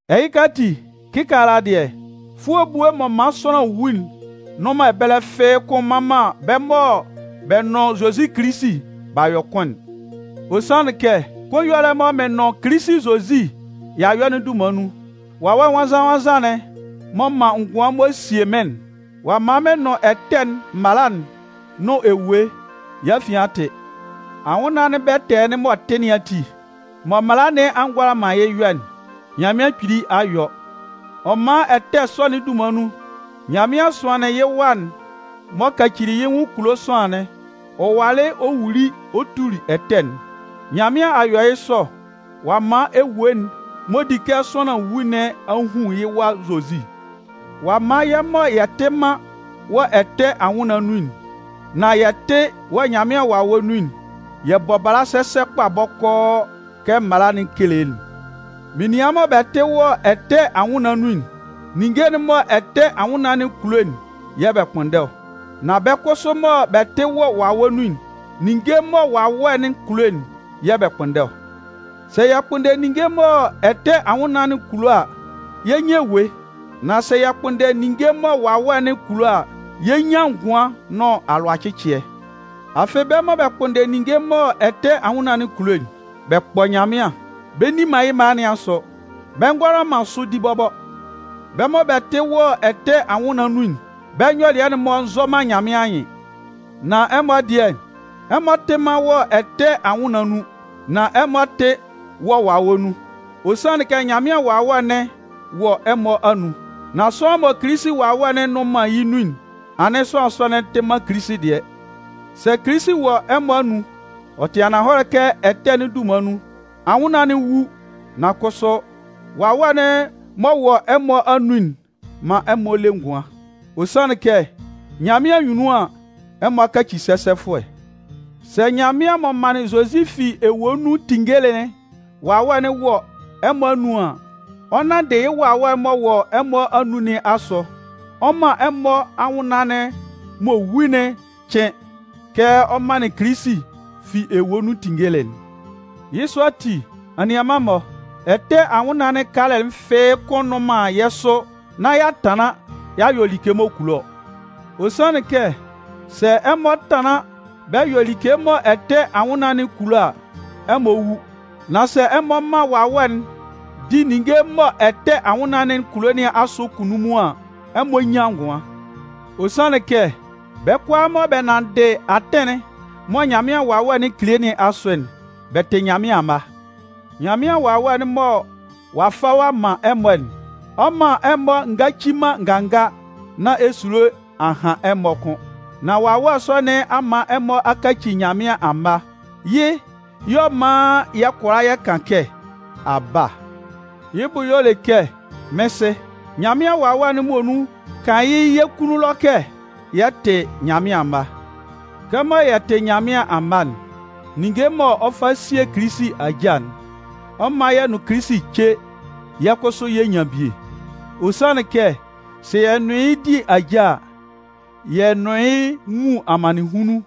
Ɛhɩka ati, kɩkaala dɩɛ, fʋɔ ebue mɔ man sʋanlan wu'n nnʋn man ɛbɛlɛ fɩ́ɩ́ kʋ́n mman man bɛ́ mɔ bɛ nʋn Zozi Kilisi b'a yɔ kʋn'n. Ɔ sanlɩn kɛ, kʋn ɛyɔlɛ'n mɔ mɩ́n nʋn Kilisi Zozi y'a yɔ'n dunman nun, Wawɛ Nwannzan-nwannzan'n m'ɔ man ngʋan m'ɔ sie mɩ́n'n, ɔ'a man mɩn nʋn ɛtɛ'n mala'n nʋn ewue yɛ́ afian a tɩ. Anwʋnnaan'n bɛtɛɛ'n m'ɔ tɩ nɩn ati, mɔ mala nɩn a ngʋala man yɩ́ yɔ'n, Nyanmɩan Kpili a yɔ. Ɔ man ɛtɛ sɔ'n dunman nun, Nyanmɩan sʋanlɩn yɩ́ Wa'n m'ɔ kacili yɩ́ nwʋn kulo sʋanlan'n ɔ walɩ wuli ɔ tuli ɛtɛ'n. Nyanmɩan a yɔ yɩ́ sɔ, ɔ'a man ewue'n m'ɔ di kɛ sʋanlan wu nɩn a hun yɩ́ Wa Zozi. Ɔ'a man yɛ́ mɔ yɛ tɩ man wɔ ɛtɛ anwʋnnaan nun'n, nan yɛ tɩ wɔ Nyanmɩan Wawɛ nun'n, yɛ bɔ bala sɛsɛ kpa bɔkɔɔ kɛ mala'n kele'n. Menian mɔ bɛ tɩ wɔ ɛtɛ anwʋnnaan nun'n, ninnge'n mɔ ɛtɛ anwʋnnaan'n kulo'n yɛ̂ bɛ kpʋnndɛ ɔ. Nan bɛ́ kʋsʋ mɔ bɛ tɩ wɔ Wawɛ nun'n, ninnge mɔ Wawɛ'n kulo'n yɛ̂ bɛ kpʋnndɛ ɔ. Sɛ yɛ kpʋnndɛ ninnge mɔ ɛtɛ anwʋnnaan'n kulo a, yɛ 'nyan ewue. Nan sɛ yɛ kpʋnndɛ ninnge mɔ Wawɛ'n kulo a, yɛ 'nyan ngʋan nʋn alʋacɩcɩɛ. Afɩ bɛ́ mɔ bɛ kpʋnndɛ ninnge mɔ ɛtɛ anwʋnnaan kulo'n, bɛ kpɔ Nyanmɩan, bɛ nni man yɩ́ mala nɩn asʋ. Bɛ ngʋala man sʋ di bɔbɔ. Bɛ́ mɔ bɛ tɩ wɔ ɛtɛ anwʋnnaan nun'n, bɛ nyɔlɩɛ'n-mɔ nzɔ man Nyanmɩan anyɩn. Nan ɛmɔ dɩɛ, ɛmɔ tɩ man wɔ ɛtɛ anwʋnnaan nun, nan ɛmɔ tɩ wɔ Wawɛ nun. Ɔ sanlɩn kɛ Nyanmɩan Wawɛ'n wɔ ɛmɔ anun. Nan sʋanlan mɔ Kilisi Wawɛ'n nnʋn man yɩ́ nun'n, anɩn sʋanlan sɔ'n tɩ man Kilisi dɩɛ. Sɛ Kilisi wɔ ɛmɔ anun, ɔ tɩ ananhɔlɛ kɛ ɛtɛ'n dunman nun, anwʋnnaan'n 'wu, nan kʋsʋ, Wawɛ'n mɔ wɔ ɛmɔ anun'n man ɛmɔ le ngʋan. Ɔ sanlɩn kɛ, Nyanmɩan anyunnun an, ɛmɔ a kaci sɛsɛfʋɛ. Sɛ Nyanmɩan m'ɔ manlɩn Zozi fi ewue nun tinngeli'n Wawɛ'n wɔ ɛmɔ anun an, ɔ 'nanndɩ yɩ́ Wawɛ m'ɔ wɔ ɛmɔ anun nɩn asʋ, ɔ 'man ɛmɔ anwʋnnaan'n m'ɔ wu'n cɩn kɛ ɔ manlɩn Kilisi fi ewue nun tinngelɩ'n. Yɩ́ sɔ ati, anianman-mɔ, ɛtɛ anwʋnnaan'n kalɛ fɩ́ɩ́ kʋ́n nnʋn man yɛ́ sʋ nán y'a tanlan y'a yɔ like m'ɔ kulo ɔ. Ɔ sanlɩn kɛ, sɛ ɛmɔ tanlan bɛ yɔ like mɔ ɛtɛ anwʋnnaan'n kulo a, ɛmɔ 'wu. Nan sɛ ɛmɔ man Wawɛ'n di ninnge mɔ ɛtɛ anwʋnnaan'n kulo nɩn asʋ kunnunmun an, ɛmɔ 'nyan ngʋan. Ɔ sanlɩn kɛ, bɛ́ kʋalaa mɔ bɛ nanndɩ atɩn'n mɔ Nyanmɩan Wawɛ'n kele nɩn asʋ'n, bɛ tɩ Nyanmɩan amma. Nyanmɩan Wawɛ'n mɔ ɔ'a fa ɔ'a man ɛmɔ'n, ɔ 'man ɛmɔ ngaci man nganga nán esulo a han ɛmɔ kʋ́n. Nan Wawɛ sɔ nɩn a man ɛmɔ a kaci Nyanmɩan amma. Yɩ́ yɛ̂ ɔ man yɛ kʋala yɛ kan kɛ: “Aba!” yɩ́ bʋ y'ɔ le kɛ “Mɩ́n Sɩ”. Nyanmɩan Wawɛ'n muonun kan yɩ́ yɛ́ kunnun ɛlɔ kɛ yɛ tɩ Nyanmɩan amma. Kɛmɔ yɛ tɩ Nyanmɩan amma'n, ninnge mɔ ɔ 'fa sie Kilisi ajâ'n, ɔ 'man yɛ nʋn Kilisi ce yɛ́ kʋsʋ yɛ nyan bie. Ɔ sanlɩn kɛ sɛ yɛ nʋn yɩ́ di ajâ a, yɛ nʋn yɩ́ nwun amannɩnhunnun,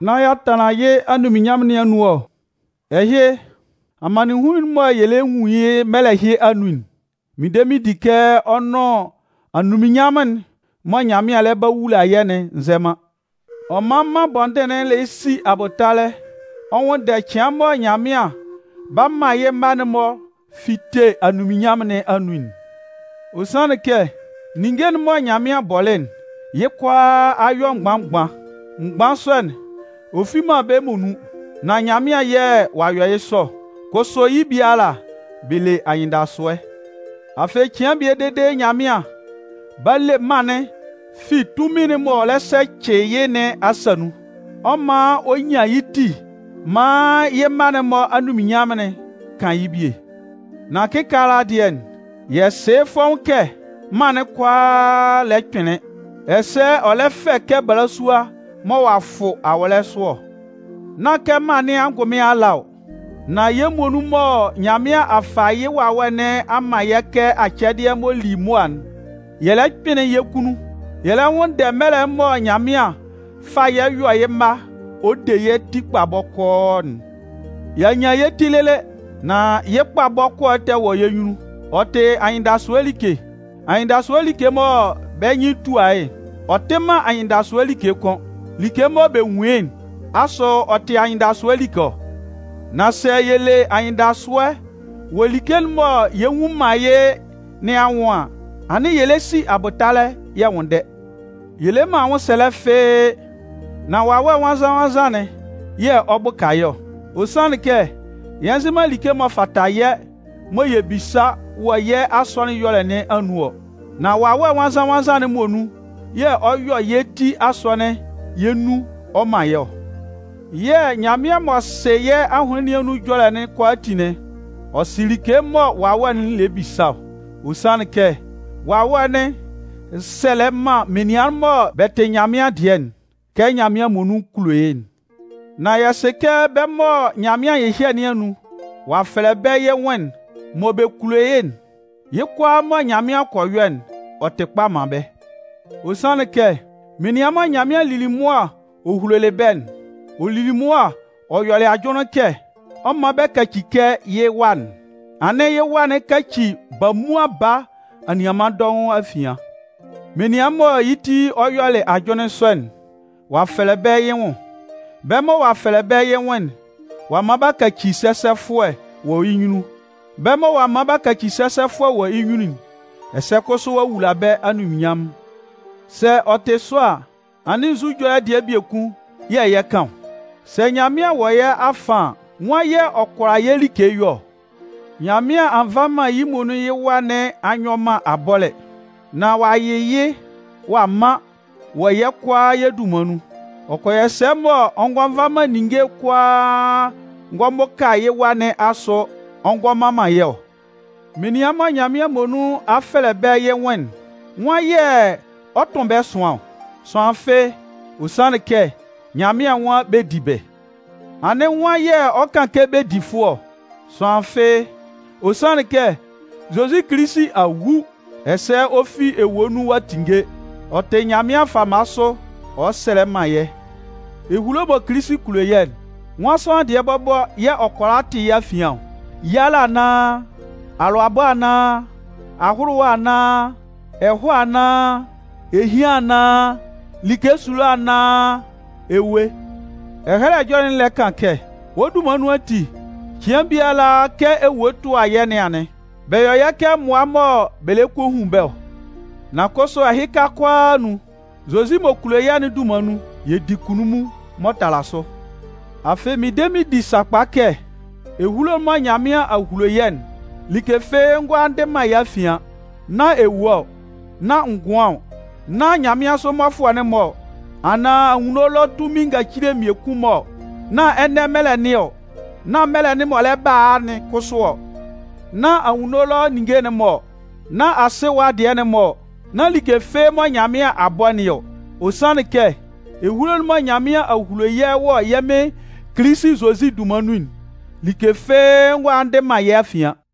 nán y'a tanlan yɩ́ anunminnyanmʋn nɩn anun ɔ. Ɛhɩ, amannɩnhunnun'n mɔ yɛ lɛ nwun yɩ́ mɛlɛ ɛhɩ anun'n, mɩn de mɩn di kɛ ɔ nʋn anunminnyanmʋn'n mɔ Nyanmɩan lɛ ba wula yɛ́'n nzɛ man. Ɔ man mân bɔndɩn'n lɛ si abʋtalɛ ɔ nwʋnndɛ cɩan mɔ Nyanmɩan 'ba man yɩ́ mma'n-mɔ fite anunminnyanmʋn nɩn anun'n. Ɔ sanlɩn kɛ ninnge'n mɔ Nyanmɩan bɔlɩ'n, yɩ́ kʋalaa a yɔ mgban-mgban. Mgban sɔ'n, ɔ fi man bɛ́ muonun, nan Nyanmɩan yɛ̂ ɔ'a yɔ yɩ́ sɔ ɔ. Kʋsʋ yɩ́ biala, bɛ le anyɩndasʋɛ. Afɩ, cɩan bie dede Nyanmɩan 'ba le mân'n fi tunmin'n m'ɔ lɛ sɛcɩ yɩ́ nɩn asa nun. Ɔ 'man ɔ nyan yɩ́ ti maan yɩ́ mma'n-mɔ anunminnyanmʋn'n kan yɩ́ bie. Nan kɩkaala dɩɛ, yɛ sɩ yɩ́ fɔ́ʋ́n kɛ mân'n kʋalaa lɛ kpɩnlɩn, ɛsɛ ɔ lɛ fɛ kɛ balasua mɔ ɔ'a fʋ awɔlɛ sʋ ɔ. Nán kɛ mân nɩn angʋnmɩn ala ɔ, nan yɛ́ muonun mɔ Nyanmɩan a fa yɩ́ Wawɛ nɩn a man yɛ́ kɛ acɛdɩɛ m'ɔ li mʋa'n, yɛ lɛ kpɩnlɩn yɛ́ kunnun. Yɛ lɛ nwʋnndɛ mɛlɛ mɔ Nyanmɩan 'fa yɛ́ yɔ yɩ́ mma ɔ de yɛ́ ti kpa bɔkɔɔ'n. Y'a nyan yɛ́ ti lɩlɩ, nan yɩ́ kpa bɔkɔɔ'n tɛ wɔ yɛ́ nyunnun, ɔ tɩ anyɩndasʋɛ like. Anyɩndasʋɛ like mɔ bɛ́ nyɩn tua yɩ́'n, ɔ tɩ man anyɩndasʋɛ like kʋn. Like mɔ bɛ nwun yɩ́'n, asʋ ɔ tɩ anyɩndasʋɛ like ɔ? Nan sɛ yɛ le anyɩndasʋɛ wɔ like'n mɔ yɛ nnwun man yɩ́ nɩn anwʋn an, anɩn yɛ lɛ si abʋtalɛ yɛ nwʋnndɛ. Yɛ le man anwʋnsɛlɛ fɩ́ɩ́, nan Wawɛ Nwannzan-nwannzan'n yɛ̂ ɔ bʋka yɛ́ ɔ. Ɔ sanlɩn kɛ, yɛ nzɩ man like m'ɔ fata yɛ́ mɔ yɛ bisa wɔ yɛ́ asɔnɩn ɛyɔlɛ nɩn anun ɔ. Nan Wawɛ Nwannzan-nwannzan'n muonun yɛ̂ ɔ yɔ yɛ́ ti asɔnɩn yɛ́ nun ɔ man yɛ́ ɔ. Yɛ̂ Nyanmɩan m'ɔ sɩ yɛ́ ahʋnlɩn nɩn anun ɛjɔlɛ'n kʋalaatin'n, ɔ sɩ like mɔ Wawɛ'n lɛ bisa ɔ. Ɔ sanlɩn kɛ Wawɛ'n sɛlɛ man menian mɔ bɛ tɩ Nyanmɩan dɩɛ'n, kɛ Nyanmɩan muonun kulo yɩ́'n. Nan yɛ sɩ kɛ bɛ́ mɔ Nyanmɩan nyɩhyɛ nɩn anun, ɔ'a fɛlɛ bɛ yɩ́ nwʋn, mɔ bɛ kulo yɩ́'n, yɩ́ kʋalaa mɔ Nyanmɩan kɔ yɔ'n, ɔ tɩ kpa man bɛ́. Ɔ sanlɩn kɛ, menian mɔ Nyanmɩan lili mʋa hulolɩ bɛ́'n, ɔ lili mʋa ɔ yɔlɩ ajʋnlɩn kɛ ɔ 'man bɛ kaci kɛ yɩ́ Wa'n. Anɩn yɩ́ Wa'n kaci bamuan baa anianman dɔʋn afian. Menian mɔ yɩ́ ti ɔ yɔlɩ ajʋnlɩn sɔ'n, ɔ'a fɛlɛ bɛ yɩ́ nwʋn. Bɛ́ mɔ ɔ'a fɛlɛ bɛ́ yɩ́ nwʋn'n, ɔ'a man b'a kaci sɛsɛfʋɛ wɔ yɩ́ nyunnun. Bɛ́ mɔ ɔ'a man b'a kaci sɛsɛfʋɛ wɔ yɩ́ nyunnun'n, ɛsɛ kʋsʋ ɔ'a wula bɛ́ anunminnyanmʋn. Sɛ ɔ tɩ sɔ a, anɩn nzu ɛjɔlɛ dɩɛ biekun yɛ̂ yɛ 'kan ɔ? Sɛ Nyanmɩan wɔ yɛ́ afan an, nwan yɛ̂ ɔ kʋala yɛ́ like yɔ ɔ? Nyanmɩan a nva man yɩ́ muonun yɩ́ Wa nɩn a nyɔ man abɔlɛ, nan ɔ'a yɩ yɩ́ ɔ'a man wɔ yɛ́ kʋalaa yɛ́ dunman nun. Ɔ kɔ yɔ sɛ mɔ ngɔ fa man ninnge kʋala ngɔ bʋka yɩ́ Wa nɩn asʋ ngɔ man man yɛ́ ɔ? Menian mɔ Nyanmɩan muonun a fɛlɛ bɛ́ yɩ́ nwʋn'n, nwan yɛ̂ ɔ 'tʋn bɛ́ ɛsʋan ɔ? Sʋanlan fɩ́ɩ́. Ɔ sanlɩn kɛ Nyanmɩan nwan bɛ di bɩ. Anɩn nwan yɛ̂ ɔ 'kan kɛ bɛ di fʋɔ ɔ? Sʋanlan fɩ́ɩ́. Ɔ sanlɩn kɛ Zozi Kilisi a wu. Ɛsɛ ɔ fi ewue nun ɔ'a tinnge. Ɔ tɩ Nyanmɩan fama sʋ ɔ sɛlɛ man yɛ́. Ehulo mɔ Kilisi kulo yɛ́'n, nwan sʋanlan dɩɛ bɔbɔ yɛ́ ɔ kʋala tɩ yɛ́ afian ɔ? Yalɛ anaan, alʋabɔ anaan, ahʋlʋwa anaan, ɛhɔɛ anaan, ehian anaan, like esulo anaan ewue? Ɛhɛlɛ Ɛjɔlɛ'n lɛ kan kɛ: Wɔ́ dunman nun ati, cɩan biala kɛ ewue tʋa yɛ́ nɩn anɩn. Bɛ yɔ yɛ́ kɛ mmʋa mɔ bɛ lɛ kɔ a hun bɛ́ ɔ. Nan kʋsʋ ɛhɩka kʋalaa anun, Zozi m'ɔ kulo yɛ́'n dunman nun, yɛ di kunnunmun m'ɔ tala sʋ. Afɩ mɩn de mɩn di sakpa kɛ, ehulo'n mɔ Nyanmɩan a hulo yɛ'n, like fɩ́ɩ́ ngʋala ndɩ man yɛ́ afian. Nán ewue ɔ, nán ngʋan ɔ, nán nyanmɩansʋ mmɔfʋɛ'n-mɔ anaan anwunno ɛlɔ tunmin ngacile mmiekun-mɔ ɔ, nán ɛnɛ mɛlɛ nɩn ɔ, nán mɛlɛ'n m'ɔ lɛ ba a'n kʋsʋ ɔ, nán anwunno ɛlɔ ninnge'n-mɔ ɔ, nán asɩ ɛwa dɩɛ'n-mɔ ɔ, nán like fɩ́ɩ́ mɔ Nyanmɩan a bɔ nɩn ɔ. Ɔ sanlɩn kɛ, ehulo'n mɔ Nyanmɩan a hulo yɛ́ wɔ yɛ́ Mɩn Kilisi Zozi dunman nun'n, like fɩ́ɩ́ ngʋala ndɩ man yɛ́ afian.